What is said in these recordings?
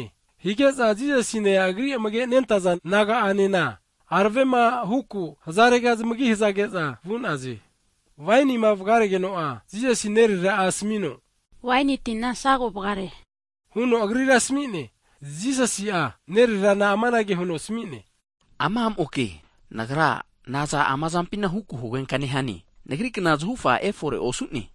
Ana hige'za Jisasine Agri amage nentaza disaipol naga'anena, aravema huku hzarega zamagi hazage'za vu'naze. Wainima vgaregeno'a, Jisasi nerera'a asmi'no, waini tina sago vgare'ne huno Agrira asmi'ne. Jisasi'a nererana amanage huno asmi'ne, ama a' moke, Nagra naza ama zampina huku hugenka nehane? Nagri kna zahufa efore osu'ne.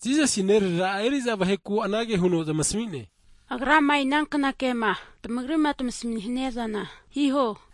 Jisasina nerera'a eri'za vaheku anage huno zamasmi'ne, Agrama inankna kema tmagrima tmasminia'zana hiho.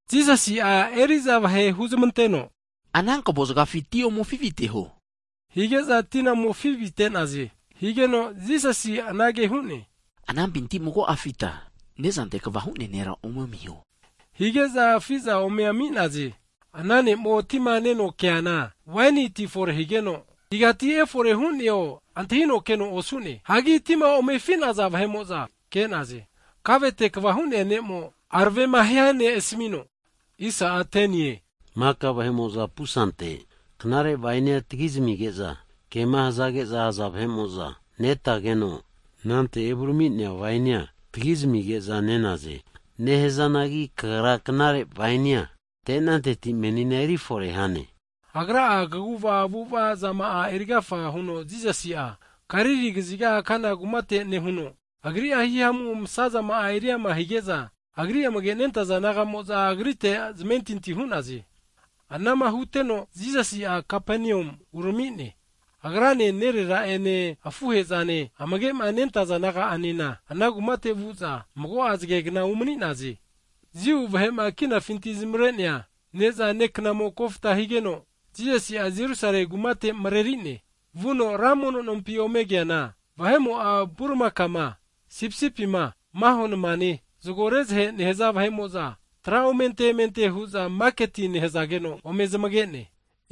Jisasi'a eri'za vahe huzmanteno ana kvo zgafi ti ome afi viteho hige'za tina ome afi vite'naze. Higeno Jisasi anage hu'ne, anampinti mago'a afita ne'zante kva hu'nea nera ome amiho, hige'za afi'za ome ami'naze. Ana ne'mo tima neno keana waini ti fore higeno, igati efore hu'neo antahino keno osu'ne, (hagi tima omefi'naza vahe'moza ke'naze), kavete kva hu'nea ne'mo aravema hia ne' asmi'no, maka vahe'moza pusante knare wainia tgi zamige'za kema hazage'za, aza vahe'moza netageno, anante evurami'nea waini'a tgi zamige'za nenaze. Nehazanagi kagra knare wainia ante'nanteti menina eri fore hane! Agra'a kaguva avu'ava zama'a erigafa huno Jisasi'a Galili kaziga Kana kumate nehuno, Agri'a hihamu msa zama'a eri ama hige'za, Agri amage nentaza disaipol naga'mo'za Agrite zamentinti hu'naze. Anama huteno Jisasi'a Kapenium urami'ne, Agrane nerera ene afuhe'zane amagema nentaza disaipol naga'anena ana kumate vu'za mago'a zgegna umani'naze. Jiu vahe'ma kinafinti zamare'nea (Pasova) neza'ne knamo kofta higeno Jisasi'a Jerusale kumate mreri'ne. Vuno ra mono nompi omege'neana vahe'mo'a vurimaka'ma, sipisipi'ma, maho nmane, zgo rezahe nehza vahe'moza tra omente emente hu'za maketi nehzageno ome zamage'ne.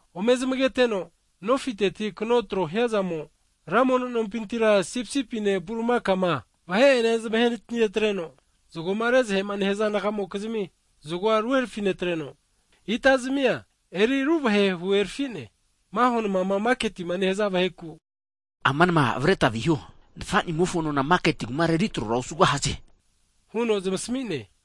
Ome zamageteno nofite kno tro hiazamo ra mono nompintira sipisipi'ne vurimakane vahe'ene zamahenati'netreno zgoma re'zahema nehaza naga'mokizmi zgoa ruherafi netreno, ita zamia eriruvahe huherfi'ne. Maho nmama maketima nehza vaheku, Ama nma avreta viho. Nfa'nimofo nona maketi kumara eri tro osugahaze, huno zamasmi'ne.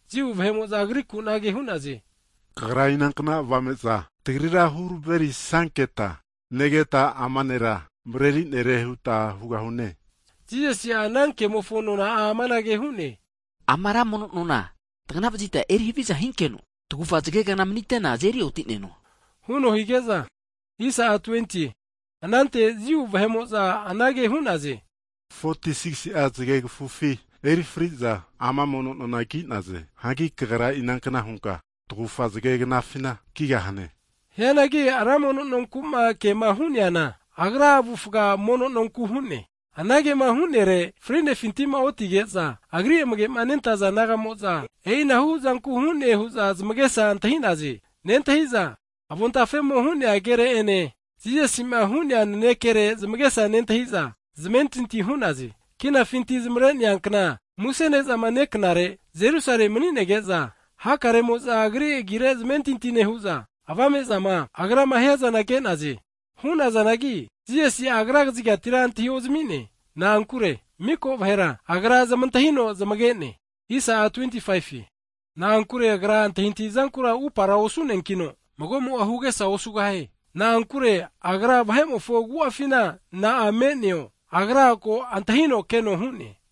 Jiu vahe'mo'za Agriku anage hu'naze, Kagra inankna avame'za tagrira huraverisanketa negeta ama nera mrerisa nere huta hugahune? Jisasi'a ana kemofo nona'a amanage hu'ne. Ama ra mono nona tgana vazitma eri haviza hinkeno tagufa zgegna manite'na azeri oti'neno, huno hige'za, anante Jiu vahe'mo'za anage hu'naze, 46si'a zgegfu eri fri'za ama mono nona ki'naze. Hagi Kagra inankna hunka tagufa zge knafina kigahane? Hianagi ra mono nonku'ma kema hu'neana, Agra avufa mono nonku hu'ne. Anagema hu'nere, fri'nefinti'ma otige'za, Agri amage nentaza disaipol nagamo'za e'inahu zanku hu'ne hu'za zamagesa antahi'naze. Nentahi'za avon tafemo hu'nea kere ene, Jisasi'ma hu'nea nanekere zamagesa nentahi'za zamentinti hu'naze. Kinafinti zamavre'nea kna antahimiza (Pasova) muse ne'zama ne'knare Jerusale mani'nege'za, hakaremo'za Agri agire zamentinti nehu'za, kaguvazama Agrama hiazana ke'naze. Hu'nazanagi, Jisasi'a Agra kzigatira antahiozmi'ne. Na'ankure miko vahera Agra zamantahino zamage'ne. Na'ankure, Agra antahiantahizankura upara osuneankino magomo'a hugesa osugahie. Na'ankure, Agra vahe'mofo agu'afina na'a me'neo, ko antahino keno hu'ne.